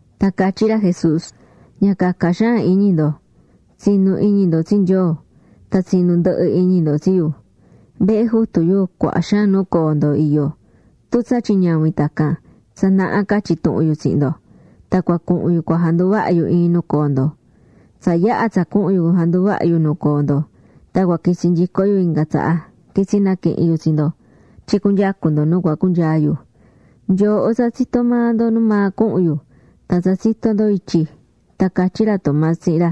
Tan catyí ra Jesús: ―Ña caca xaan iñi ndo. Tsi̱nu iñi ndo tsi Nyoo, tan tsi̱nu ndɨhɨ iñi ndo tsi yu. Vehe Jutu yu cuaha xaan nu coo ndo iyó. Tun tsatyin ñavin tacan, tsa naha catyi̱ tuhun yu tsihin ndo. Tan cua cuhun yu cua janduvaha yu iin nu coo ndo. Tsa yaha̱ tsa cuhun yu janduvaha yu nu coo ndo, tan cua quitsi nyico yu inga tsaha, quitsi naquihin yu tsi ndo tyin cuyucu ndo nu cua cunyaa yu. Nyooho tsa tsitó maa ndo nu maa cuhun yu, tan tsa tsitó ndo ityi. Tan catyí ra Tomás tsihin ra: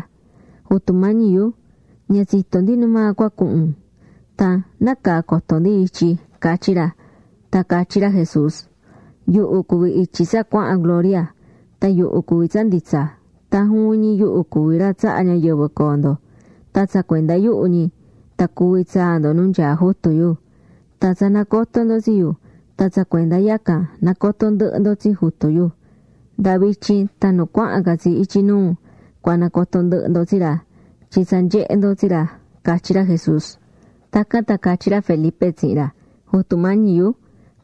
―Jutu Mañi yu, ña tsitó ndi nu maa cua cuhun un. Tan ¿nácaa coto ndi ityi? ―catyí ra. Tan catyí ra Jesús: ―Yuhu cuví ityi tsa cuahán gloria. Tan yuhu cuví tsa nditsa. Tan juvin ñi yuhu cuví ra tsahá ñayɨvɨ coo ndo. Tan tsa cuenda yuhu ñi, tan cuvi tsaa ndo nu nyaá Jutu yu. Tan tsa nacotó ndo tsi yu, tan tsa cuenda yacan nacotó ndɨhɨ ndo tsi Jutu yu. Nda vityin tan nu cuahán ca tsi ityi nuu, cua nacoto ndɨhɨ ndo tsi ra, tyin tsa nyehé ndo tsi ra ―catyí ra Jesús. Tacan tan catyí ra Felipe tsihin ra: ―Jutu Mañi yu,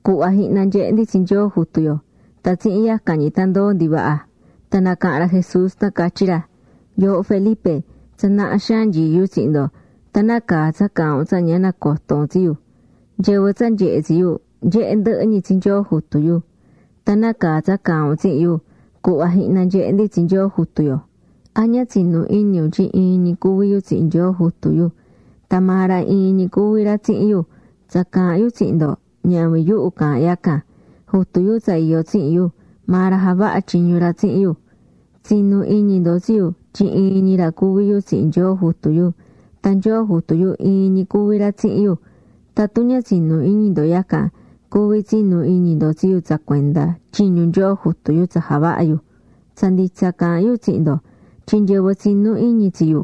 cu̱hva jihna nyehe ndi tsi Nyoo Jutu yo, tan tsihin yacan ñi tan ndoo ndi vaha. Tan nacaha̱n ra Jesús, tan catyí ra: ―Yooho Felipe, tsa naha xaan nyií yu tsihin ndo, tan ¿nácaa tsa caahán un tsa ña nacotó un tsi yu? Nyɨvɨ tsa nyehé tsi yu, nyehé ndɨhɨ ñi tsi Nyoo Jutu yu. Tan ¿nácaa tsa caahán un tsihin yu: “Cu̱hva jihna nyehe ndi tsi Nyoo Jutu yo”? ¿A ña tsinú iñi un tyin iin ñi cuví yu tsihin Nyoo Jutu yu? Tan maa ra iin ñi cuví ra tsihin yu. Tsa caahán yu tsihin ndo, ñavin yuhu caahán yacan. Jutu yu tsa iyó tsihin yu, maa ra javahá tyiñu ra tsihin yu. Tsi̱nu iñi ndo tsi yu tyin iin ñi ra cuví yu tsihin Nyoo Jutu yu. Tan Nyoo Jutu yu iin ñi cuví ra tsihin yu. Tatun ña tsinú iñi ndo yacan, cuví tsinu iñi ndo tsi yu tsa cuenda tyiñu Nyoo Jutu yu tsa javahá yu. Tsa nditsa caahán yu tsihin ndo tyin nyɨvɨ tsinú iñi tsi yu,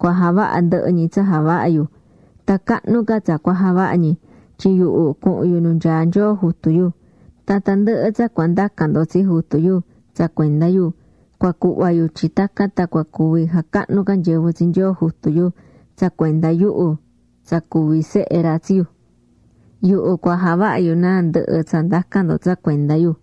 cua javaha ndɨhɨ ñi tsa javahá yu. Tan cahnu ca tsa cua javaha ñi, tyin yuhu cuhun yu nu nyaá Nyoo Jutu yu. Tan tandɨhɨ tsa cua ndacan ndo tsi jutu yu tsihin sɨvɨ yu, cua ñihi ndo can tyin tacan tan jacahnu cuaha ca nyɨvɨ tsi Nyoo Jutu yu tsa cuenda yuhu tsa cuví yu Sehe ra. Yuhu cua javaha yu náa ndɨhɨ tsa ndacan ndo tsa cuenda yu.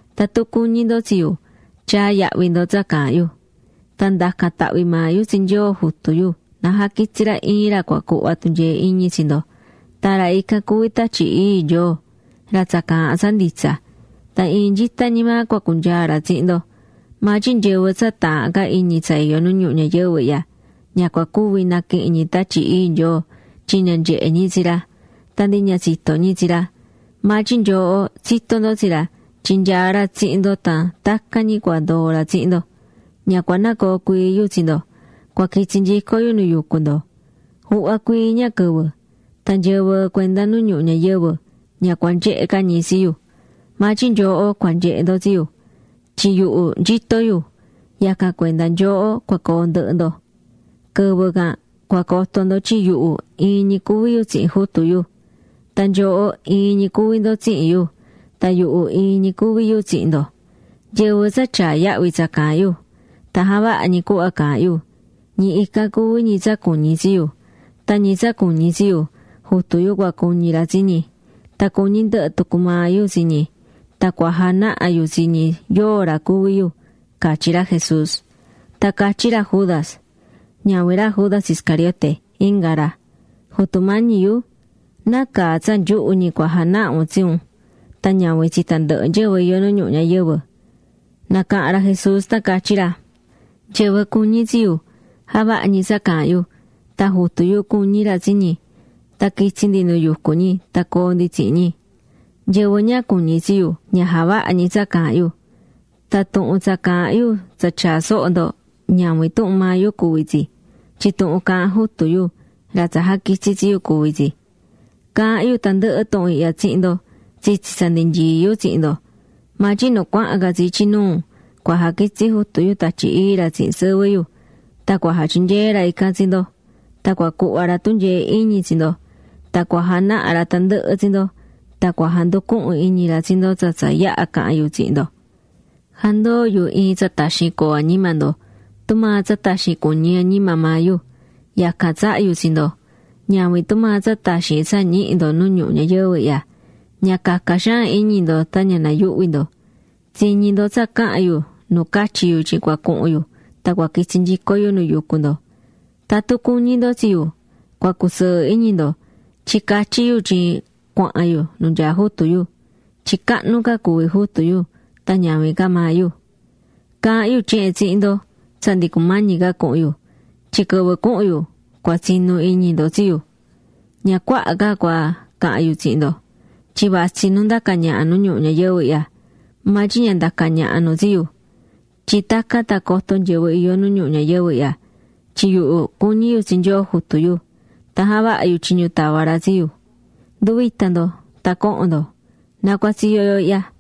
’Tatun cuñí ndo tsi yu, tya̱a yahvi ndo tsa caahán yu. Tan ndacan tahvi maa yu tsi Nyoo Jutu yu na jaquitsi ra iin ra cua cuhva tunyee iñi tsi ndo. Tan ra ican cuví Tatyi Ii Nyoo, ra tsa caahán tsa nditsa. Tan iin nyita ñi maa cua cunyaa ra tsihin ndo. Maa tyin nyɨvɨ tsa taahán ca iñi tsa iyó nu ñuhu ñayɨvɨ ihya, ña cua cuvi naquihin ñi Tatyi Ii Nyoo tyin ña nyehe ñi tsi ra. Tan ndi ña tsitó ñi tsi ra. Maa tyin nyooho tsitó ndo tsi ra tyin nyaá ra tsihin ndo tan tacan ñi cua ndoo ra tsihin ndo. Ña cua nacoo cuii yu tsi ndo. Cua quitsi nyico yu nu yucú ndo. Juhva cuii ña quɨvɨ, tan nyɨvɨ cuenda nu ñuhu ñayɨvɨ ña cua nyehe ca ñi tsi yu. Maa tyin nyooho cua nyehe ndo tsi yu. Tyin yuhu nyito yu, yacan cuenda nyooho cua coo ndɨhɨ ndo. Quɨvɨ can cua coto ndo tyin yuhu iin ñi cuví yu tsihin Jutu yu. Tan nyooho iin ñi cuví ndo tsihin yu. Tan yuhu iin ñi cuví yu tsihin ndo. Nyɨvɨ tsa tyaá yahvi tsa caahán yu, tan javahá ñi cuhva caahán yu, ñi ican cuví ñi tsa cuñí tsi yu. Tan ñi tsa cuñí tsi yu, Jutu yu cua cuñi ra tsi ñi. Tan cuñí ndɨhɨ tucu maa yu tsi ñi tan cua janaha yu tsi ñi yóo ra cuví yu ―catyí ra Jesús. Tan catyí ra Judas, ñavin ra Judas Iscariote, inga ra. ―Jutu Mañi yu, ¿nácaa tsa nyuhu ñi cua janaha un tsi un, tan ñavin tsi tandɨhɨ nyɨvɨ iyó nu ñuhu ñayɨvɨ? Nacaha̱n ra Jesús tan catyí ra: ―Nyɨvɨ cuñí tsi yu, javahá ñi tsa caahán yu. Tan Jutu yu cuñi ra tsi ñi. Tan quitsi ndi nu yucú ñi tan coo ndi tsihin ñi. Nyɨvɨ ña cuñí tsi yu, ña javahá ñi tsa caahán yu. Tan tuhun tsa caahán yu tsa tyaá soho ndo, ñavin tuhun maa yu cuví tsi, tyin tuhun caahán Jutu yu, ra tsa jaquitsi̱ tsi yu, cuví tsi. ’Caahán yu tandɨhɨ tuhun ihya tsihin ndo tsitsi tsa ndi nyií yu tsihin ndo. Maa tyin nu cuahán ca tsi ityi nuu cua jaquitsi Jutu yu Tatyi Ii ra tsihin sɨvɨ yu. Tan cua jatyinyee ra ican tsi ndo, tan cua cuhva ra tunyee iñi tsi ndo, tan cua janaha ra tandɨhɨ tsi ndo. Tan cua janducuhun iñi ra tsi ndo tsa tsa yaha̱ caha̱n yu tsihin ndo. ’Jandoó yu iin tsa taxin coo añima ndo, tumaa tsa taxin cuñí añima maa yu. Yacan tsahá yu tsi ndo. Ñavin tumaa tsa taxin tsa ñihí ndo nu ñuhu ñayɨvɨ ihya. Ña ca̱ca xaan iñi ndo tan ña na̱yuhvi ndo. Tsiñi̱ ndo tsa caha̱n yu nu catyi̱ yu tyin cua cuhun yu tan cua quitsi nyico yu nu yucú ndo. Tatun cuñí ndo tsi yu, cua cusɨɨ iñi ndo tyin catyí yu tyin cuahan yu nu nyaá Jutu yu. Tyin cahnu ca cuví Jutu yu tan ñavin ca maa yu. Caahán yu tyehen tsihin ndo tsa ndi cumañi ca cuhun yu, tyin quɨvɨ cuhun yu, cua tsinu iñi ndo tsi yu. ’Ña cuaha ca cua cahan yu tsihin ndo. Tyin vatsí nu ndacá ñaha nu ñuhu ñayɨvɨ ihya. Maa tyin ña ndacá ñaha nu tsi yu. Tyin tacan tan coto nyɨvɨ iyó nu ñuhu ñayɨvɨ, tyin yuhu cuñí yu tsi Nyoo Jutu yu, tan javahá yu tyiñu tava̱ ra tsi yu. ’Ndu̱vita ndo, tan co̱hon ndo, na cua tsiyo yo ihya.